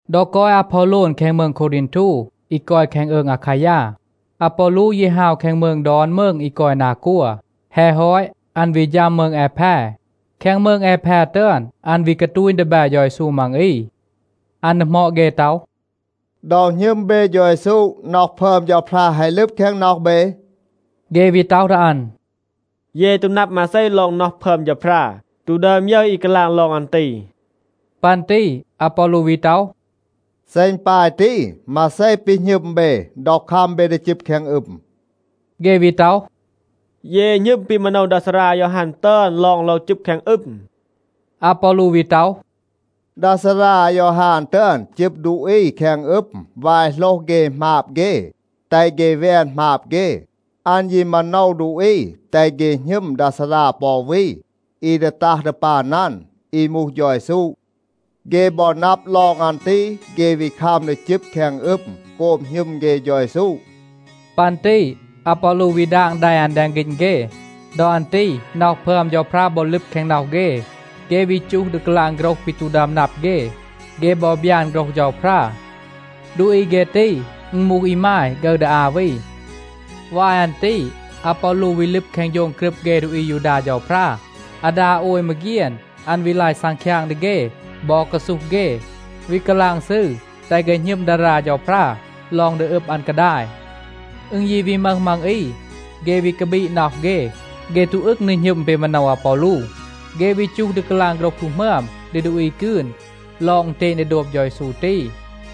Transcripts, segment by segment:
ดอ กอย อาพอโลน แคง มืง โควรีนทู (อี กอย แคง อืง อาคายา), อาปอลู ยี ฮาว แคง มืง ดอน มืง อี กอย นา กัว. แฮะ ฮอต, อัน วี ฌัม มืง แอแพ. แคง มืง แอแพ ตึอน, อัน วี กาตูณ ดีแบ เฌา เยซู มัง อี. อัน ดีหมอด เฆ ต็อห, “ดอ หณึม เบ เฌา เยซู, น็อห พึอม เฌาพรา แฮะ ลึบ แคง น็อห เบ?” เฆ วี ต็อห ดี อัน, “เย ตู นับ มาเซ ลอง น็อห พึอม เฌาพรา, ตู ดึอม ยึร อี กาลาง ลอง อัน ตี.” ปัน ตี อาปอลู วี ต็อห, “เซ อึณ ปาย ตี, มาเซ ปี หณึม เบ ดอ คัม เบ ดี จึบ แคง อึม?” เฆ วี ต็อห, “เย หณึม ปี มาโนว ดา ซารา อายอฮาน ตึอน ลอง โลว จึบ แคง อึม.” อาปอลู วี ต็อห, “ดา ซารา อายอฮาน ตึอน จึบ ดูอี แคง อึม วาย โหลห เฆ หมาบ เฆ, แตห เฆ แวน หมาบ เฆ. อัน ยี มาโนว ดูอี, แตห เฆ หณึม ดา ซารา ปอ อู วี, อี ดี ตัห ดี ปัน อัน, อี มูห เฌา เยซู. เฆ บอ นับ ลอง อัน ตี, เฆ วี คัม ดี จึบ แคง อึม โกบ หณึม เฆ เฌา เยซู.” ปัน ตี อาปอลู วี ดาง แด อัน แดง ฆีณ เฆ. ดอ อัน ตี น็อห พึอม เฌาพรา บอ ลึบ แคง น็อห เฆ. เฆ วี จูห ดี กาลาง โฆรห ปี ตู ดึอม นับ เฆ. เฆ บอ บยาน โฆรห เฌาพรา. ดูอี เฆ ตี, อึณ มูห อีมาย ฆึร ดี อา วี. วาย อัน ตี อาปอลู วี ลึบ แคง โฌง กรึบ เฆ ดูอี อายูดา เฌาพรา. อาดา โอย มาเฆียน อัน วี ลาย ซังคยาง ดี เฆ บอ กาซูห เฆ, วี กาลาง ซืร แตห เฆ หณึม ดารา เฌาพรา ลอง ดี อึบ อัน กาดาย. อึณ ยี วี มึห มัง อี, เฆ วี กาบีด น็อห เฆ. เฆ ตู อึง ดี หณึม ปี มาโนว อาปอลู. เฆ วี จูห ดี กาลาง โฆรห ตู หมึอม ดี ดูอี กืน ลอง อึณเตณ ดี โดบ เฌา เยซู ตี.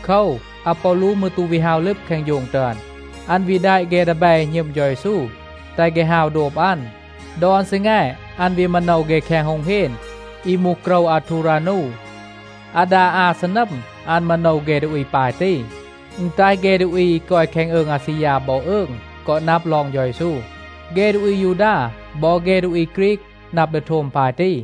โคว, อาปอลู มืร ตู วี ฮาว ลึบ แคง โฌง ตึอน. อัน วี แดะ เฆ ดีแบ อี หณึม เฌา เยซู, แตห เฆ ฮาว โดบ อัน. ดอน ซีแง อัน วี มาโนว เฆ แคง โฮง เฮน อี มูห โกรว อาทูรานู. อาดา อา ซีนัม อัน มาโนว เฆ ดูอี ปาย ตี. อึณ แตห เฆ ดูอี อี กอย แคง อืง อาซียา บอ อืง กอ นับ ลอง เฌา เยซู. เฆ ดูอี อายูดา บอ เฆ ดูอี ฆรีก นับ ดี โทม ปาย ตี.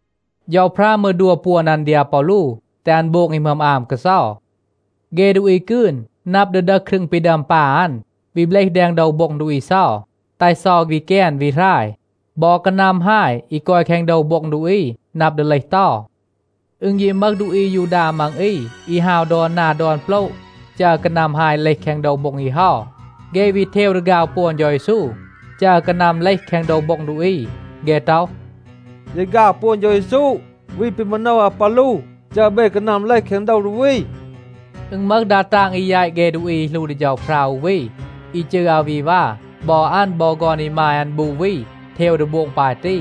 เฌาพรา มืร ดัว ปวน อัน ดี อาปอลู, แตห อัน โบง อี หมึอม อาม กาเซา. เฆ ดูอี กืน นับ ดี ดึห ครึง ปี ดึอม ปา อัน, วี เบลห แดง โดว โบ็ง ดูอี เซา, แตห เซา วี แกน วี หราย. บอ กานัม ฮาย อี กอย แคง โดว โบ็ง ดูอี นับ ดี เลห เตา. อึณ ยี มึห ดูอี อายูดา มัง อี อี ฮาว ดอน นา ดอน โปละ จัร กานัม ฮาย เลห แคง โดว โบ็ง อี เฮา. เฆ วี เทว ดี ฆาว ปวน เฌา เยซู, จัร กานัม เลห แคง โดว โบ็ง ดูอี. เฆ ต็อห, “เย ฆาว ปวน เฌา เยซู วี ปี มาโนว อาปอลู, จัร เบ กานัม เลห แคง โดว ดูอี.” อึณ มึห ดา ตาง อี แยต เฆ ดูอี อี หลู ดี เฌาพรา อู วี, อี จืร อาวีวา. บอ อัน บอ ฆอน อีมาย อัน บู วี เทว ดี โบง ปาย ตี.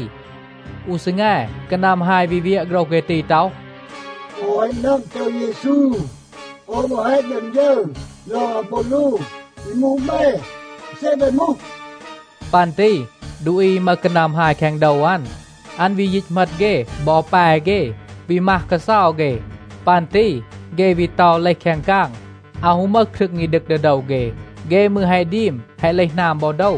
อู ซีแง, กานัม ฮาย วี เวียะ โฆรห เฆ ตี ต็อห, “โอว แฮะ นับ เฌา เยซู. โอว มืร แฮะ ดึอม ยึร ลอง อาปอลู. อี มูห เบ, อาเซ เบ มูห?” ปัน ตี ดูอี อี มึห กานัม ฮาย แคง โดว อัน, อัน วี ยีต เหมต เฆ บอ แป เฆ, วี มัห กาเซา เฆ. ปัน ตี เฆ วี เตา เลห แคง กาง, อาว ฮู มึห ครึง อี ดึก ดี โดว เฆ, เฆ มืร แฮะ ดีม แฮะ เลห หนาม บอ โดว.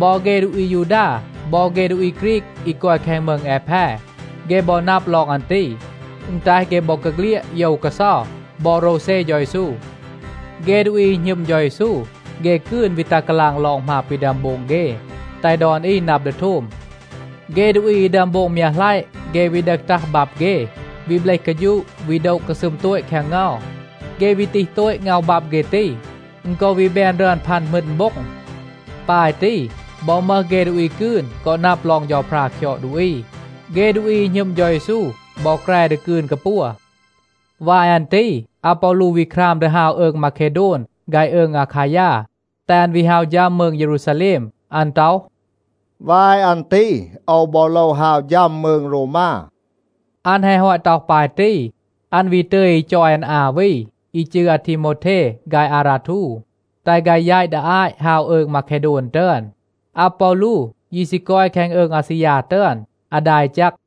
บอ เฆ ดูอี อายูดา บอ เฆ ดูอี ฆรีก อี กอย แคง มืง แอแพ, เฆ บอ นับ ลอง อัน ตี. อึณ แตห เฆ บอกาเฆลียด โยว กาเซา บอ โรวเซ เฌา เยซู. เฆ ดูอี อี หณึม เฌา เยซู, เฆ กืน วี ตัห กาลาง ลอง หมาบ ปี ดึอม โบง เฆ, แตห ดอน อี นับ ดี โทม. เฆ ดูอี อี ดึอม โบง มยัะหลัยะ เฆ วี ดึห ตัห บับ เฆ, วี เบลห กาฌูะ, วี โดะ กาซึม โตต แคง เงา. เฆ วี ตีห โตต ง็อห บับ เฆ ตี, อึณ กอ วี แบน รึอน พัน หมึณ โบ็ง. ปาย ตี บอ มึห เฆ ดูอี กืน กอ นับ ลอง เฌาพรา คยอด ดูอี. เฆ ดูอี อี หณึม เฌา เยซู บอ แกร ดี กืน กาปัว. วาย อัน ตี อาปอลู วี คราม ดี ฮาว อืง มาเคโดน ฆาย อืง อาคายา, แตห อัน วี ฮาว ฌัม มืง เยรูซาแลม. อัน ต็อห, “วาย อัน ตี โอว บอ โลว ฮาว ฌัม มืง โรวมา.” อัน แฮะ ฮอต ต็อห ปาย ตี, อัน วี ตึย อี จอย อัน อา วี, อี จืร อาทีโมวเท ฆาย อาราทู, แตห ฆาย แยต ดี อาต ฮาว อืง มาเคโดน ตึอน. อาปอลู ยี ซี กอย แคง อืง อาซียา ตึอน อาดา อี แจก.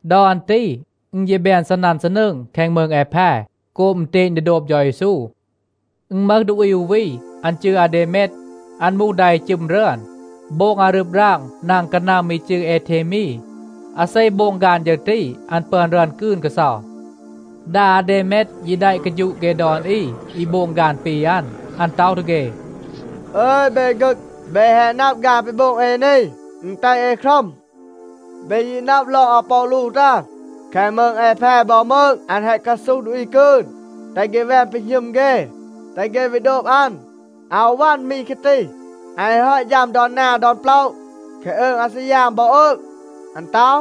ดอ อัน ตี อึณ ยี แบน ซีนัน ซีนืง แคง มืง แอแพ โกบ อึณเตณ ดี โดบ เฌา เยซู. อึณ มึห ดูอี อู วี, อัน จืร อาเดเมด. อัน มูห ดา อี จึม รึอน, โบง อารึบ ราง นาง กานัม อี จืร เอเทมี. อาเซ โบง ฆาน ฌึร ตี, อัน ปึอน รึอน กืน กาเซา. ดา อาเดเมด ยี แดะ กาฌูะ เฆ ดอน อี, อี โบง ฆาน ปี อัน. อัน ต็อห ดี เฆ “อึย เบ ฆึก, เบ แฮะ นับ ฆาน ปี โบง เอ นี, อึณ แตห เอ ครัม. เบ ยี นับ ลอง อาปอลู ตึอน. แคง มืง แอแพ บอ มืง อัน แฮะ กาซูห ดูอี กืน, แตห เฆ แวน ปี หณึม เฆ, แตห เฆ วี โดบ อัน. อาว วัน มี แคะ ตี. อัน แฮะ ฮอต ฌัม ดอน นา ดอน โปละ แคง อืง อาซียา บอ อืง. อัน ต็อห,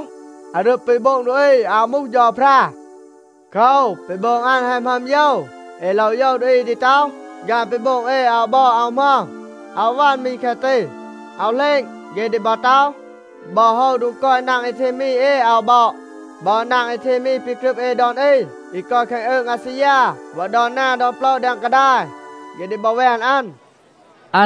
อารึบ ปี โบง ดูอี อาว มูห เฌาพรา. โคว, ปี โบง อัน แฮะ หมึอม โยว. เอ โลว โยว ดูอี ดี ต็อห, ‘ฆาน ปี โบง เอ อาว บอด, อาว หมึอม.’ อาว วัน มี แคะ ตี. อาว เหลณ, เฆ ดี บอ ต็อห, บอ โฮว โดง กอย นาง เอเทมี เอ อาว บอด. บอ นาง เอเทมี ปี กรึบ เอ ดอน อี อี กอย แคง อืง อาซียา บอ ดอน นา ดอน โปละ แดง กาดาย, เฆ ดี บอ แวน อัน.”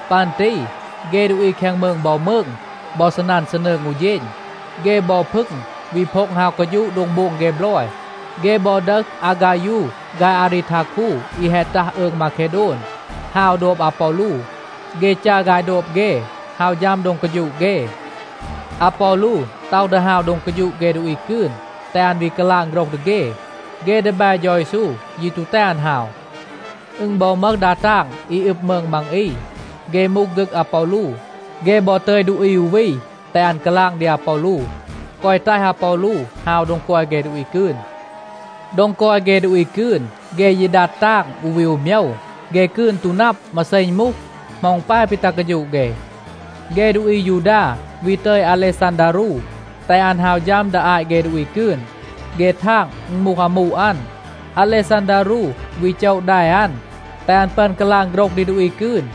ปัน ตี เฆ ดูอี แคง มืง บอ มืง บอ ซีนัน ซีนืง อู เฌณ. เฆ บอ พึง วี โพ็ง ฮาว กาฌูะ โดง โบง เฆ บลอย. เฆ บอ ดึห อาฆายู ฆาย อารีทาคู อี แฮะ ตัห อืง มาเคโดน, ฮาว โดบ อาปอลู. เฆ จัร ฆาย โดบ เฆ, ฮาว ฌัม โดง กาฌูะ เฆ. อาปอลู ต็อห ดี ฮาว โดง กาฌูะ เฆ ดูอี กืน, แตห อัน วี กาลาง โฆรห ดี เฆ. เฆ ดีแบ เฌา เยซู ยี ตู แตห อัน ฮาว. อึณ บอ มึห ดา ตาง อี อึบ มืง มัง อี. เฆ มูห ฆึก อาปอลู. เฆ บอ ตึย ดูอี อู วี, แตห อัน กาลาง ดี อาปอลู, แกวะ แตห อาปอลู ฮาว โดง กอย เฆ ดูอี กืน. โดง กอย เฆ ดูอี กืน, เฆ ยี ดัด ตาง, อู วี อู โมยว. เฆ กืน ตู นับ, มาเซ อึณ มูห, เหมา อึณ ปาย ปี ตัห กาฌูะ เฆ. เฆ ดูอี อายูดา วี ตึย อาเลซันดารู, แตห อัน ฮาว ฌัม ดี อาต เฆ ดูอี กืน. เฆ ทาง อึณ มูห อามู อัน. อาเลซันดารู วี โจะ แด อัน, แตห อัน ปึอน กาลาง โฆรห ดี ดูอี กืน.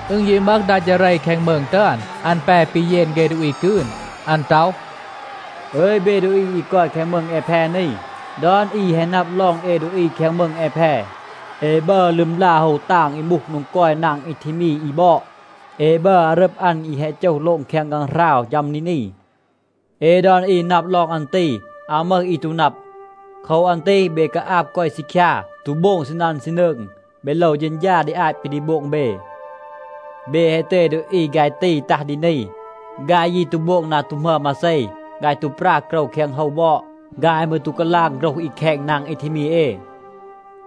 อึณ ยี มึห ดา จาเร แคง มืง ตึอน. อัน แป ปีเยน เฆ ดูอี กืน. อัน ต็อห, “อึย เบ ดูอี อี กอย แคง มืง แอแพ นี. ดอน อี แฮะ นับ ลอง เอ ดูอี แคง มืง แอแพ, เอ บัร ลึมลา โฮว ตาง อี มูห โดง กอย นาง เอเทมี อี บอด. เอ บัร อารึบ อัน อี แฮะ โจห โลง แคง ฆางหราว, ฌัม ดี นี. เอ ดอน อี นับ ลอง อัน ตี. อาว มึห อี ตู นับ. โคว อัน ตี เบ กาอาบ กอย ซีคยา, ตู โบง ซีนัน ซีนืง, เบ โลว เฌณฌา ดี อาต ปี ดี โบง เบ. เบ แฮะ ตึย ดูอี ฆาย ตี ตัห ดี นี. ฆาย ยี ตู โบง นา ตู หมึอม มาเซ. ฆาย ตู ปรา โกรว แคง โฮว บอด. ฆาย มืร ตู กาลาง โฆรห อี แคณ นาง เอเทมี เอ.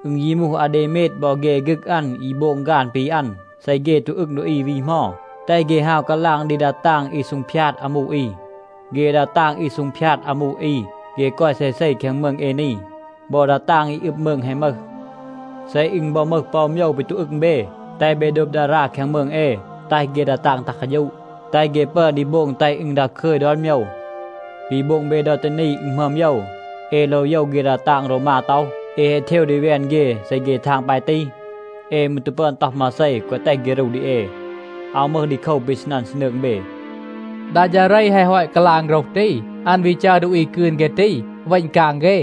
อึณ ยี มูห อาเดเมด บอ เฆ ฆึก อัน อี โบง ฆาน ปี อัน, เซ เฆ ตู อึง ดูอี วี เหมา, แตห เฆ ฮาว กาลาง ดี ดา ตาง อี ซูงพยาด อามู อี. เฆ ดา ตาง อี ซูงพยาด อามู อี, เฆ กอย เซเซ แคง มืง เอ นี. บอ ดา ตาง อี อึบ มืง แฮะ มึห. เซ อึณ บอ มึห ปอ อู โมยว ปี ตู อึง เบ, แตห เบ โดบ ดารา แคง มืง เอ, แตห เฆ ดา ตาง ตัห กาฌูะ, แตห เฆ ปึอน ดี โบง แตห อึณ ดาคึย ดอน โมยว. ปี โบง เบ ดอ ตี นี, อึณ หมึอม โยว. เอ โลว โยว เฆ ดา ตาง โรวมา ต็อห, เอ แฮะ เทว ดี แวน เฆ. เซ เฆ ทาง ปาย ตี, เอ มืร ตู ปึอน ต็อห มาเซ, แกวะ แตห เฆ รู ดี เอ. อาว มึห ดีโคว ปี ซีนัน ซีนืง เบ.” ดา จาเร แฮะ ฮอต กาลาง โฆรห ตี, อัน วี จัร ดูอี กืน เฆ ตี เวณ กาง เฆ.